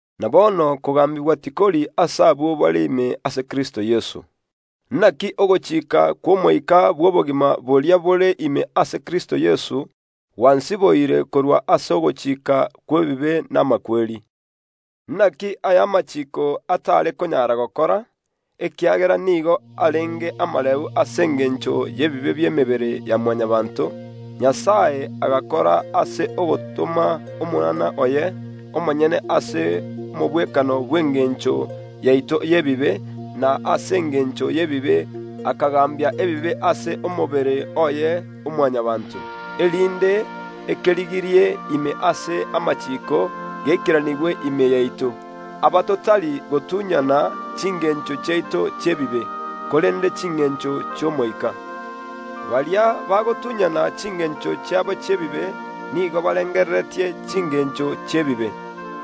Na bono kogaambigwa tikori ase abwo bare ime ase Kristo Yeso. Inaki ogochika kw’Omoika bw’obogima boria bore ime ase Kristo Yeso gwansiboire korwa ase ogochika kw’ebibe na amakweri. Inaki aria amachiiko atare konyara gokora, ekiagera nigo arenge amareu ase engencho y’ebibe bi’emebere ya Mwanyabaanto, Nyasae agakora ase ogotoma Omwana oye omonyene ase omogwekano bw’engencho yaito y’ebibe, na ase engencho y’ebibe, akagaambia ebibe ase omobere oye o Mwanyabaanto, erinde ekerigirie ime ase amachiiko geikeranigwe ime yaito, aba totari gotunyana chingencho chiaito chi’ebibe, korende chingencho chi’Omoika. Baria bagotunyana chingencho chiabo chi’ebibe nigo barengereretie chingencho chi’ebibe,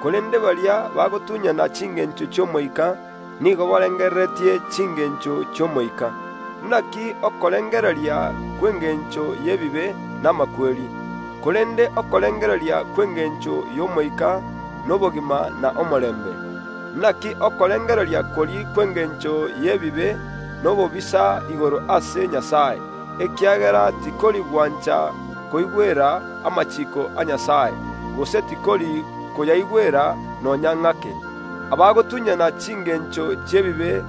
korende baria bagotunyana chingencho chi’Omoika nigo barengereretie chingencho chi’Omoika. Inaki okorengereria kw’engencho y’ebibe n’amakweri, korende okorengereria kw’engencho y’Omoika nobogima na omorembe. Inaki okorengereria koria kw’engencho y’ebibe nobobisa igoro ase Nyasae, ekiagera tikori gwancha koigwera amachiiko a Nyasae, gose tikori koyaigwera nonya ng’ake. Abagotunyana chingencho chi’ebibe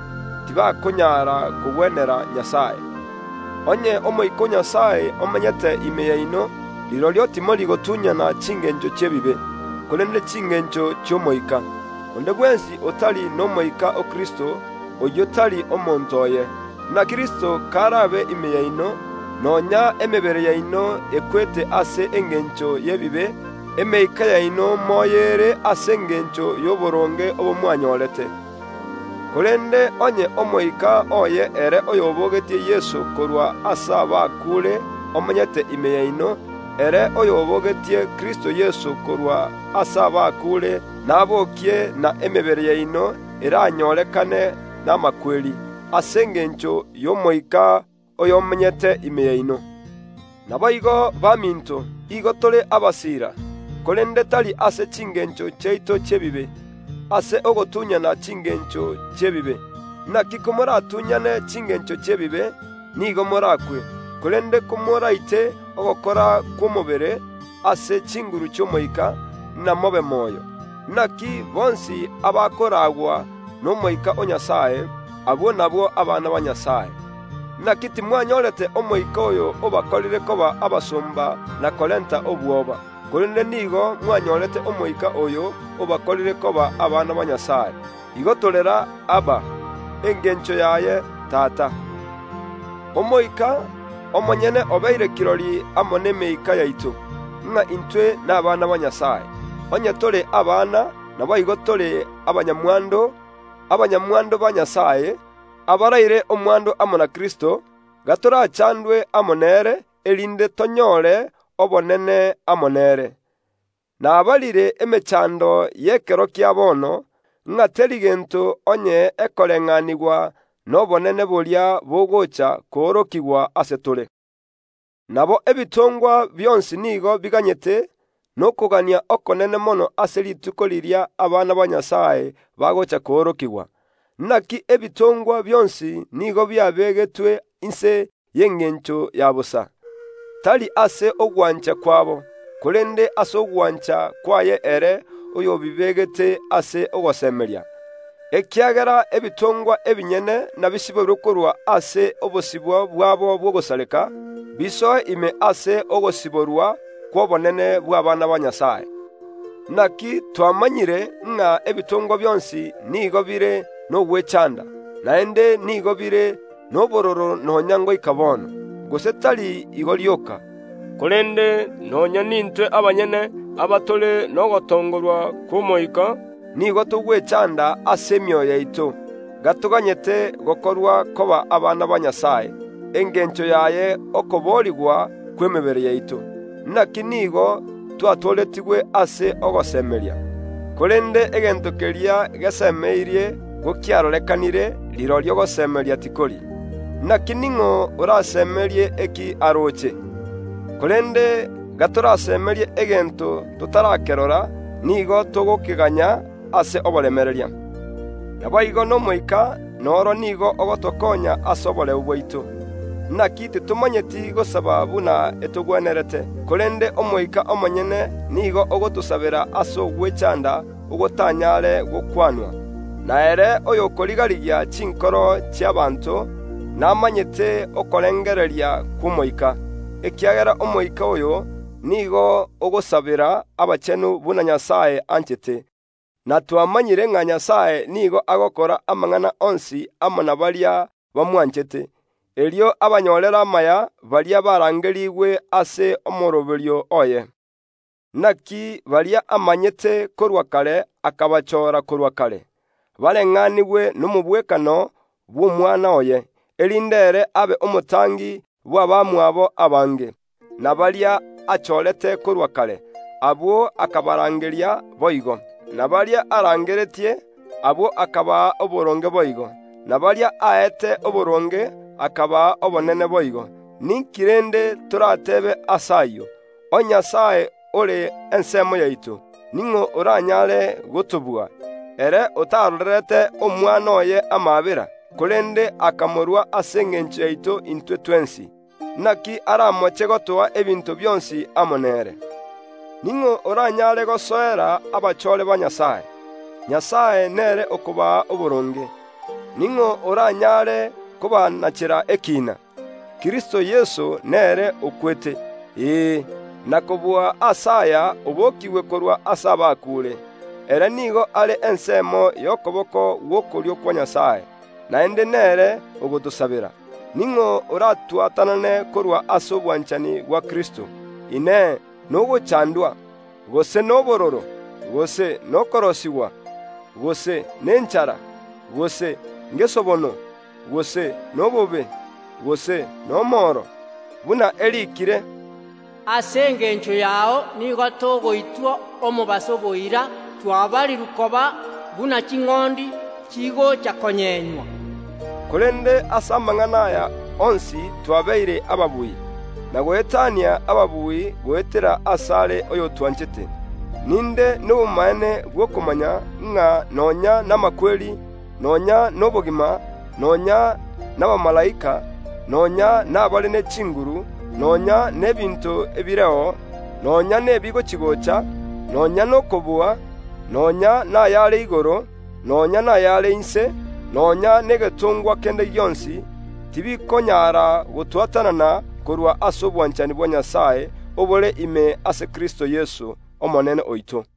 tibakonyara kogwenera Nyasae. Onye Omoika o Nyasae kamenyete ime yaino, rirorio timori gotunyana chingencho chi’ebibe, korende chingencho chi’Omoika. Onde bwensi otari n’Omoika o Kristo, oyio tari omonto oye. Na Kristo kar’abe ime yaino, nonya emebere yaino ekwete ase engencho y’ebibe, emeika yaino moyo ere ase engencho y’oboronge obo mwanyorete. Korende onye Omoika oye ere oyobogetie Yeso korwa ase abakuure omenyete ime yaino, ere oyobogetie Kristo Yeso korwa ase abakuure nabookie na emebere yaino eranyorekane n’amakweri, ase engencho y’Omoika oy’omenyete ime yaino. Naboigo baminto, igo tore abasiira, korende tari ase chingencho chiaito chi’ebibe, ase ogotunyana chingencho chi’ebibe, inaki komoratunyane chingencho chi’ebibe, nigo morakwe, korende komoraite ogokora kw’omobere ase chinguru chi’Omoika, inamobe moyo. Inaki bonsi abakoraagwa n’Omoika o Nyasae, abwo nabwo abana ba Nyasae. Inaki timwanyorete omoika oyo obakorire koba abasomba na korenta obwoba, korende nigo mwanyorete Omoika oyo obakorire koba abana ba Nyasae. Igo torera, “Abba!” Engencho yaye “Tata!” Omoika omonyene obeire kirori amo n’emeika yaito, ng’a intwe nabana ba Nyasae. Onye tore abana, naboigo tore abanyamwando, abanyamwando ba Nyasae, abaraire omwando amo na Kristo, gatorachandwe amo nere, erinde tonyore obonene amo nere. Nabarire emechando y’ekero kia bono, ng’a teri gento onye ekoreng’anigwa nobonene boria bogocha koorokigwa ase tore. Nabo ebitongwa bionsi nigo biganyete n’okogania okonene mono ase rituko riria Abana ba Nyasae bagocha koorokigwa. Inaki ebitongwa bionsi nigo biabegetwe inse y’engencho ya bosa, tari ase ogwancha kwabo, korende ase ogwancha kwaye ere oyobibegete ase ogosemeria, ekiagera ebitongwa ebinyene nabisiborwe korwa ase obosibwa bwabo bw’ogosareka, bisoe ime ase ogosiborwa kw’obonene bw’abaana ba Nyasae. Inaki twamanyire ng’a ebitongwa bionsi nigo bire n’ogwechanda, naende nigo bire n’obororo nonya ngoika bono, gose tari igo rioka, korende nonya nintwe abanyene abatore nogotongorwa kw’Omoika, nigo togwechaanda ase emioyo yaito, gatoganyete gokorwa koba abana ba Nyasae, engencho yaye okoboorigwa kw’emebere yaito. Inaki nigo twatooretigwe ase ogosemeria. Korende egento keria gesemeirie gokiarorekanire, rirorio gosemeria tikori. Inaki ning’o orasemerie eki aroche? Korende gatorasemerie egento totarakerora, nigo togokeganya ase oboremereria. Naboigo n’Omoika nere nigo ogotokoonya ase oboreu bwaito. Inaki titomanyeti gosaba buna etogwenerete, korende Omoika omonyene nigo agotosabera ase ogwechanda gotanyare gokwanwa. Na ere oyokoriga‐rigia chinkoro chi’ abanto, namanyete okorengereria kw’Omoika, ekiagera Omoika oyo nigo ogosabera abachenu buna Nyasae anchete. Na twamanyire ng’a Nyasae nigo agokora amang’ana onsi amo na baria bamwanchete, erio abanyorere amaya, baria barangerigwe ase omooroberio oye. Inaki baria amanyete korwa kare akabachoora korwa kare, bareng’anigwe n’omogwekano bw’Omwana oye, erinde ere abe omotangi bw’abamwabo abange. Na baria achorete korwa kare, abwo akabarangeria boigo; na baria arangeretie, abwo akabaa oboronge boigo; na baria aete oboronge akabaa obonene boigo. Ninki rende torateebe ase ayio? Onye Nyasae ore ensemo yaito, ning’o oranyare gotobua? Ere otarorerete Omwana oye amaabera, korende akamorua ase engencho yaito intwe twensi, inaki aramoche gotoa ebinto bionsi amo nere? Ning’o oranyare gosoera abachoore ba Nyasae? Nyasae nere okobaa oboronge. Ning’o oranyare kobanachera ekiina? Kristo Yeso nere okwete, ee, na kobua ase aya obokiigwe korwa ase abakuure; ere nigo are ensemo y’okoboko gw’okorio kwa Nyasae, naende nere ogotosabera. Ning’o oratwatanane korwa ase obwanchani bwa Kristo? Inee! Nogochandwa, gose nobororo, gose nokorosigwa, gose nenchara, gose ngesobono, gose n’obobe, gose n’omoro? Buna eriikire, “Ase engencho yao nigo togoitwa omobaso boira; twabarirwe koba buna ching’ondi chigocha konyenywa.” Korende ase amang’ana aya onsi twabeire ababui, na goetania ababui, goetera ase are oyotwanchete. Ninde nobomaene bw’okomanya, ng’a nonya namakweri, nonya nobogima, nonya nabamalaika, nonya nabare ne chinguru, nonya n’ebinto ebireo, nonya nebi gochi‐gocha, nonya n’okobua, nonya nayare igoro, nonya nayare inse, nonya negetongwa kende gionsi, tibikonyara gotwatanana korwa ase obwanchani bwa Nyasae obore ime ase Kristo Yeso Omonene oito.